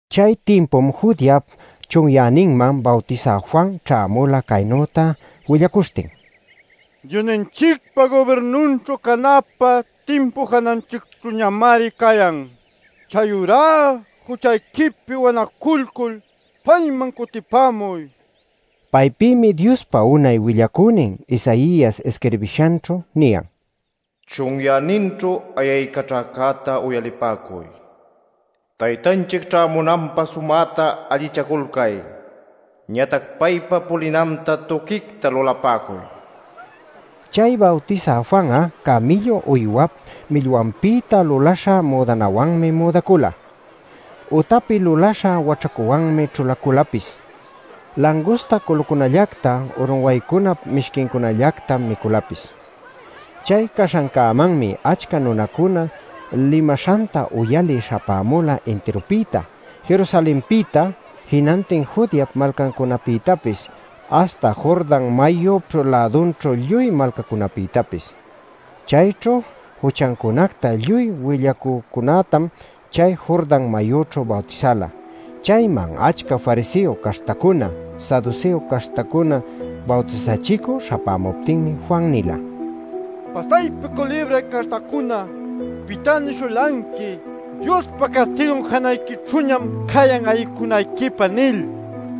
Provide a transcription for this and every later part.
Chay timpum Judeap chunyäninman Bawtisä Juan ćhämula caynüta willacuśhtin: “Diosninchicpa gubirnunćhu canapä timpu jananchicćhüñamari cayan. ¡Chayurá juchayquipi wanaculcul payman cutipämuy!” nil. Paypïmi Diospa unay willacünin Isaias isquirbishanćhu niyan: “Chunyäninćhu ayaycaćhäcäta uyalipäcuy: ‘Taytanchic ćhämunanpä sumäta allichaculcay. Ñatac paypa pulinanta tuquicta lulapäcuy’” nil. Chay Bawtisä Juan'a camïllu uywap millwanpïta luläśha müdanawanmi müdacula; utapi luläśha waćhacuwanmi ćhulaculapis. Langusta culucunallacta urunwaycunap mishquincunallactam miculapis. Chay caśhancämanmi achca nunacuna limaśhanta uyalï śhapämula intirupïta: Jerusalenpïta, jinantin Judeap malcancunapïtapis, aśhta Jordan mayup lädunćhu lluy malcacunapïtapis. Chayćhu juchancunacta lluy willapacücunätam chay Jordan mayućhu bawtisala. Chayman achca fariseo caśhtacuna, saduseo caśhtacuna bawtisachicü śhapämuptinmi Juan nila: “¡Pasaypi culibray caśhtacuna! ¿pitá nishulanqui ‘¡Diospa castigun janayquićhüñam cayan ayicunayquipä!’ nil?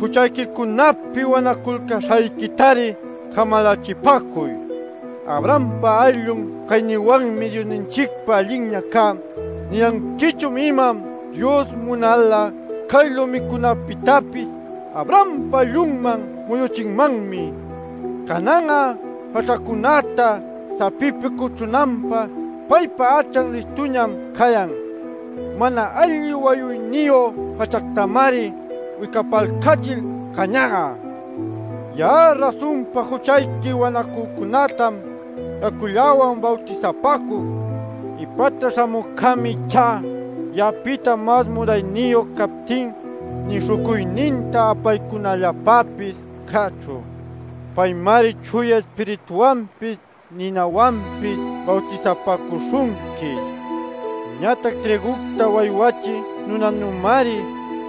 Juchayquicunapi wanaculcäśhayquitari camalachipäcuy. ‘Abrahampa ayllun caynïwanmi Diosninchicpa allinña cá’ ¿niyanquichun, imam? Dios munal'a cay lumicunapïtapis Abrampa ayllunman muyuchinmanmi. Canan'a jaćhacunäta sapipi cuchunanpá paypa ächan listuñam cayan. Mana alli wayuyniyu jaćhactamari wicapalcachil cañan'a. “Ya'a rasunpa juchayqui wanacücunätam yacullawan bawtisapäcuc. Ipäta śhamücämi ichá ya'apïta mas munayniyu captin nï śhucuyninta apaycunalläpäpis cächu. Paymari Chuya Ispirituwanpis ninawanpis bawtisapäcuśhunqui. Ñatac trïgucta waywachï nunanümari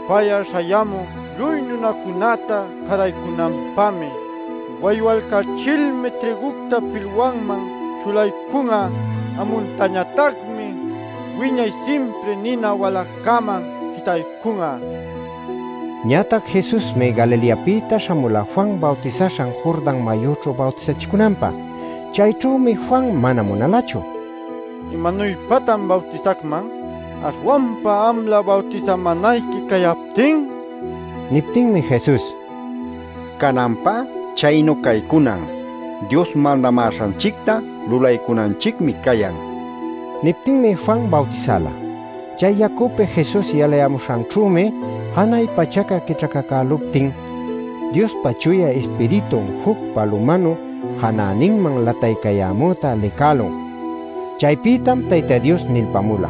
pay'a śhayämun, lluy nunacunäta cäraycunanpämi. Waywalcachilmi trïgucta pilwanman ćhulaycun'a; amuntañatacmi wiñay simpri nina waläcäman jitaycun'a” nin. Ñatac Jesusmi Galileapïta śhamula Juan bawtisaśhan Jordan mayüćhu bawtisachicunanpä. Chayćhümi Juan mana munalachu “¿Imanuypatan bawtisacman aśhwanpa amlä bawtisamänayqui cayaptin?” nil. Niptinmi Jesus: “Cananpá chaynu caycunan. Dios mandamäśhanchicta lulaycunanchicmi cayan” nin. Niptinmi Juan bawtisala. Chay yacupi Jesus yalayämuśhanćhümi, janay pachaca quićhacacüluptin, Diospa Chuya Ispiritun juc palumanu janäninman lataycayämüta licälun. Chaypïtam Tayta Dios nilpamula: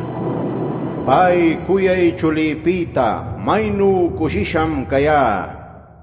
“Pay cuyay chulïpïta ¡maynu cushisham cayá!” nil.